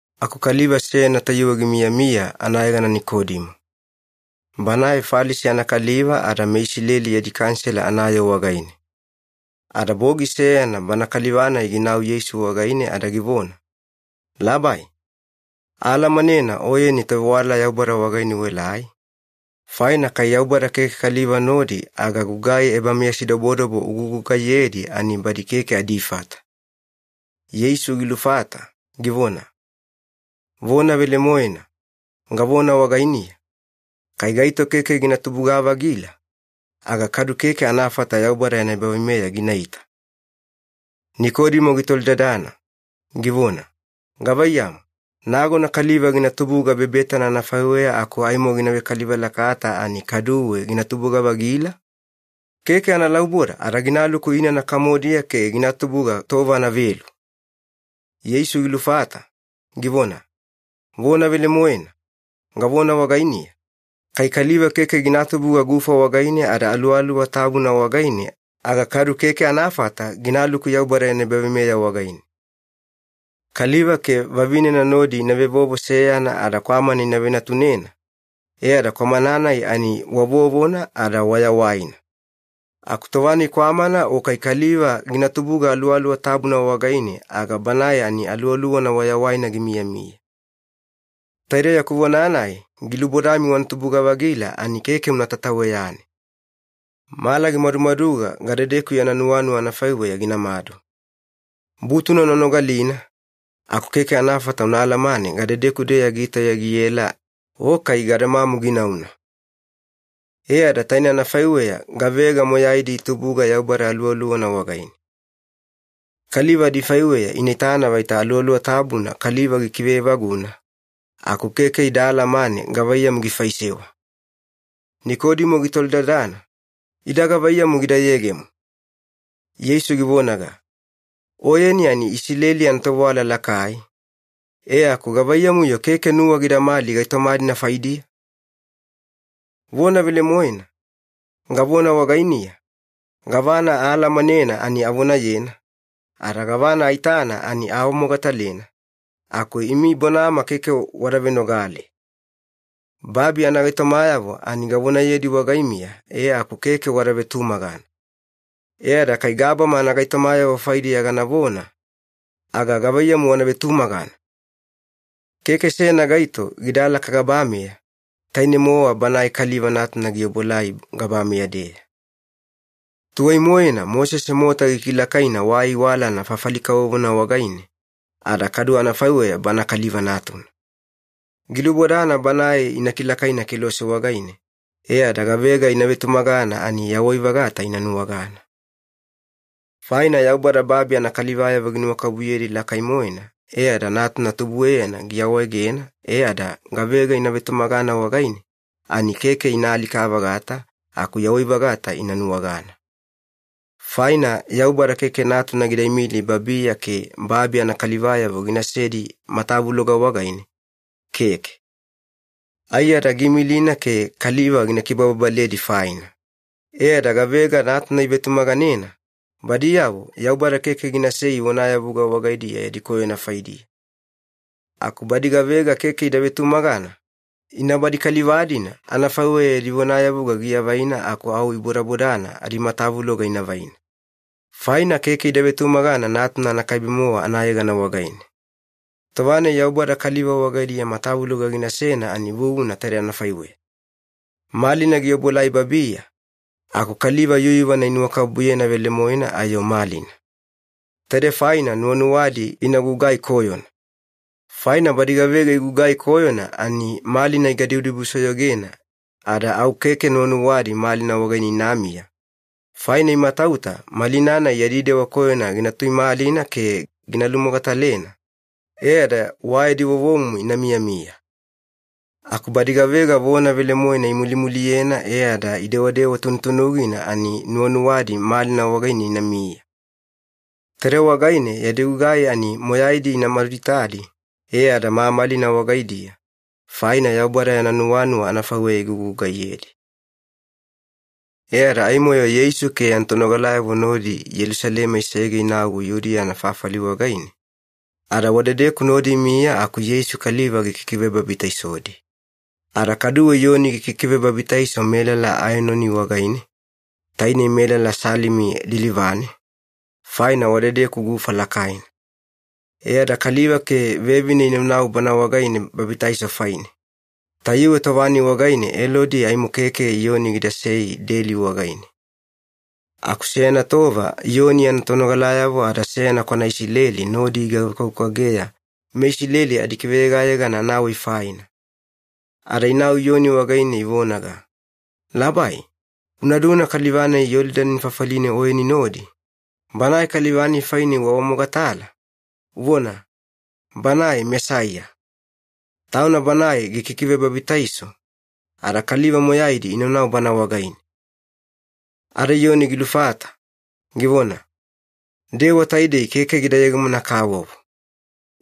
Aku kaliva seyana tayuwe gimiyamiya anayegana Nikodimo. Banae Falisi anakaliva ada meIsileli yadi Kanisela anayoo wagaine. Ada bogi seyana bana kaliva-nai ginau Yeisu wagaine ada givona, “Labai, aalamanena Oyeni tovewala Yaubada wagaine uelai, faina kai Yaubada keke kaliva nodi aga gugai ebameyasidobodobo ugugugaiyedi ani badi keke adifata.” Yeisu gilufata, givona, “Vona velemoena, gavona wagainiya, kai gaito keke gina tubuga-vagila, aga kadu keke anafata Yaubada yana ebaveimeya ginaita.” Nikodimo gitolidadana, givona, “Gavaiyamu, nagona kaliva gina tubuga bebetana anafaiweya aku aimo gina vekaliva lakata ani kaduwe gina tubuga-vagila? Keke analauboda ada ginaluku inana kamodiya ke gina tubuga tova anavelu!” Yeisu gilufata, givona, “Vona velemoena, gavona wagainiya, kai kaliva keke gina tubuga gufa wagaine ada Aluwaluwa Tabuna wagaine aga kadu keke anafata ginaluku Yaubada yana ebaveimeya wagaine. Kaliva ke vavinena nodi ina vevovo seyana ada kwamana ina venatunena, e ada kwamana-nai ani wa vovona ada wayawaina. Aku tova-nai kwamana o kai kaliva gina tubuga Aluwaluwa Tabuna wagaine, aga banae ani aluwaluwana wayawaina gimiyamiya. Taidei yaku vona-nai ‘Gilubodami wana tubuga-vagila’ ani keke una tataweyane. Mala gimadumaduga gadedeku yana nuwanuwa anafaiweya ginamadu. Butuna una nogalina, aku keke anafata una alamane gadedeku-deya gitauya giela o kai gadamamu ginauna. E ada tainei anafaiweya gavega moyaidi itubuga Yaubada Aluwaluwana wagaine. Kaliva adifaiweya ina itana vaita Aluwaluwa Tabuna kaliva gikive evaguna, aku keke ida alamane gavaiyamu gifaisewa.” Nikodimo gitolidadana, “Ida gavaiyamu gida yegemo?” Yeisu givonaga, “Oyeni ani Isileli anatovewala lakai, e aku gavaiyamu-yo keke nuwa gidamali gaitoma-dina faidiya? Vona velemoena, gavona wagainiya, gavana aalamanena ani avonayena, ada gavana aitana ani aawamogatalena, aku imi bonama keke wada venogale. Babi anagaitomayavo ani gavonayedi wagaimiya e aku keke wada vetumagana. E ada kai gabama anagaitomayavo faidiya ganavona, aga gavaiyamu wana vetumagana? Keke seyana gaito gidalaka gabameya, tainei-mowa Banae Kaliva Natuna giobuelai gabameya-deya. Tuwai-moena Mosese mota gikilakaina wa aiwalana fafali kavovona wagaine, ada kadu anafaiweya Bana Kaliva Natuna. Gilubodana Banae ina kilakaina kelose wagaine e ada gavega ina vetumaganena ani yawai-vagata ina nuwagana. Faina Yaubada babi anakalivayavo ginuwakabubuyedi lakai-moena e ada Natuna tubueyana giawaegena e ada gavega ina vetumagana wagaine ani keke ina alika-vagata aku yawai-vagata ina nuwagana. Faina Yaubada keke Natuna gida imili babiya ke babi anakalivayavo ginasedi matavuloga wagaine, keke. Aiyada giimilina ke kaliva gina kibababaledi faina. E ada gavega Natuna ivetumaganena, badiyavo Yaubada keke ginasei vonayavuga wagaidiya yadi koyona faidiya. Aku badi gavega keke ida vetumagana, ina badi kaliva-dina anafaiweya yadi vonayavuga giavaina aku au ibodabodana adimatavuloga ina vaina. Faina keke ida vetumagana Natuna anakaibe-mowa anayegana wagaine. Tova-nai Yaubada kaliva wagaidiya matavuloga ginasena ani vuvuna taide anafaiweya. Malina giobuelai babiya, aku kaliva yuyuvana inuwakabubuyena velemoena ayo malina. Taidei faina nuwanuwadi ina gugai koyona. Faina badi gavega igugai koyona ani malina igadibudibusoyogena ada au keke nuwanuwadi malina wagaine inamiya, faina imatauta malina-nai yadi dewa koyona gina tuimalina ke gina lumogatalena, e ada wa yadi vovomumu ina miyamiya. Aku badi gavega vona velemoena imulimuliyena e ada idewadewa tunutunugina ani nuwanuwadi malina wagaine inamiya. Taidei wagaine yadi gugai ani moyaidi ina maduitadi e ada mamalina wagaidiya, faina Yaubada yana nuwanuwa anafaiweya igugugaiyedi.” E ada aimo-yo Yeisu ke yana tonogalayavo nodi Yelusalema isege inau Yudiya anafafali wagaine, ada wadedeku nodi imiya aku Yeisu kaliva gikikivebabitaisodi. Ada kaduwe Iyoni gikikivebabitaiso melala Aenoni wagaine, tainei melala Salimi lilivane, faina wadedeku gufa lakaina. E ada kaliva ke vevine inaunau bana wagaine babitaiso faine. Tayuwe tova-nai wagaine Elodi aimo keke Iyoni gidasei deli wagaine. Aku seyana tova Iyoni yana tonogalayavo ada seyana kwana Isileli nodi igavekwavekwageya meIsileli adikiveyegayegana anawai faina. Ada inau Iyoni wagaine ivonaga, “Labai, una duna kaliva-nai Yolidani fafaline Oyeni nodi, Banae kaliva-nai faine uawamogatala, uvona, ‘Banae Mesaiya’. Tauna Banae gikikivebabitaiso, ada kaliva moyaidi inaunau Bana wagaine.” Ada Iyoni gilufata, givona, “Dewa taidei keke gida yegemona-kavovo.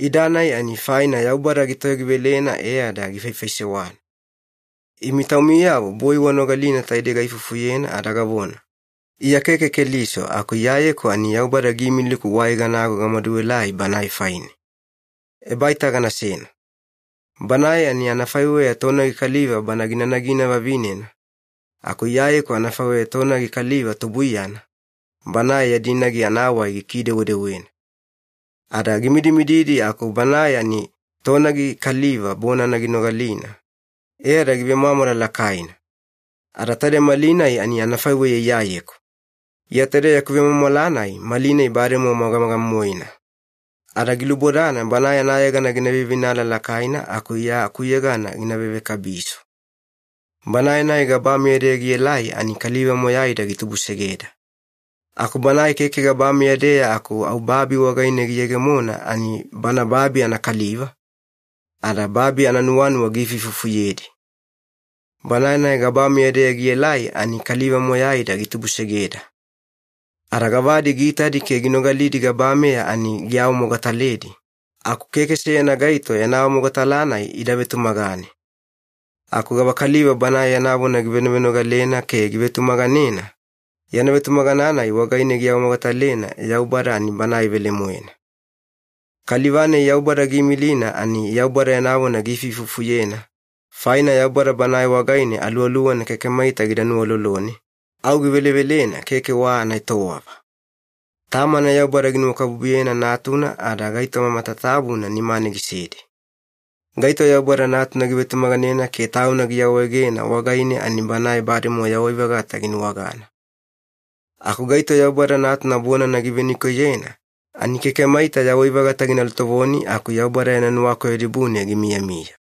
Ida-nai ani faina Yaubada gitoyogivelena e ada gifaifaisewana. Imi taumiyavo boi wanogalina taidei gaifufuyena ada gavona, ‘Iya keke Keliso aku Iyayeku ani Yaubada giimiliku wai ganago gamaduelai Banae faine.’ Ebaita ganasena. Banae ani anafaiweya tonagi kaliva bana gina nagina vavinena, aku Iyayeku anafaiweya tonagi kaliva tubuiyana, banae yadi nagi anawai gikidewedewena. Ada gimidimididi aku banae ani tonagi kaliva bonana ginogalina e ada givemwamwala lakaina. Ada taide malinai ani anafaiweya Iyayeku. Iya taide yaku vemwamwala-nai malinai bademowa magamaga-moena. Ada gilubodana Banae anayegana gina veiveinala lakaina aku Iya akuyegana ani gina vevekabiso. “Banae-nai gabameya-deya gielai ani kaliva moyaida gitubusegeda. Aku banae keke gabameya-deya aku au babi wagaine giyegemona ani bana babi anakaliva, ada babi ananuwanuwa giifuifufuyedi. Banae-nai gabameya-deya gielai ani kaliva moyaida gitubusegeda. Ada gavadi giitadi ke ginogalidi gabameya ani giawamogataledi, aku keke seyana gaito yana awamogatala-nai ida vetumagane. Aku gavakaliva Banae yana vona givenovenogalena ke givetumaganena, yana vetumagana-nai wagaine giawamogatalena Yaubada ani Banae velemoena. Kaliva-nai Yaubada giimilina ani Yaubada yana vona giifuifufuyena, faina Yaubada Banae wagaine Aluwaluwana keke maita gida nuwalolone, au givelevelena keke wa anaetowava. Tamana Yaubada ginuwakabubuyena Natuna ada gaitoma matatabuna nimane gisedi. Gaito Yaubada Natuna givetumaganena ke tauna giawaegena wagaine ani banae bademowa yawai-vagata ginuwagana. Aku gaito Yaubada Natuna bonana givenikoiyena ani keke maita yawai-vagata gina lutovoni aku Yaubada yana nuwakoyo dibune gimiyamiya.”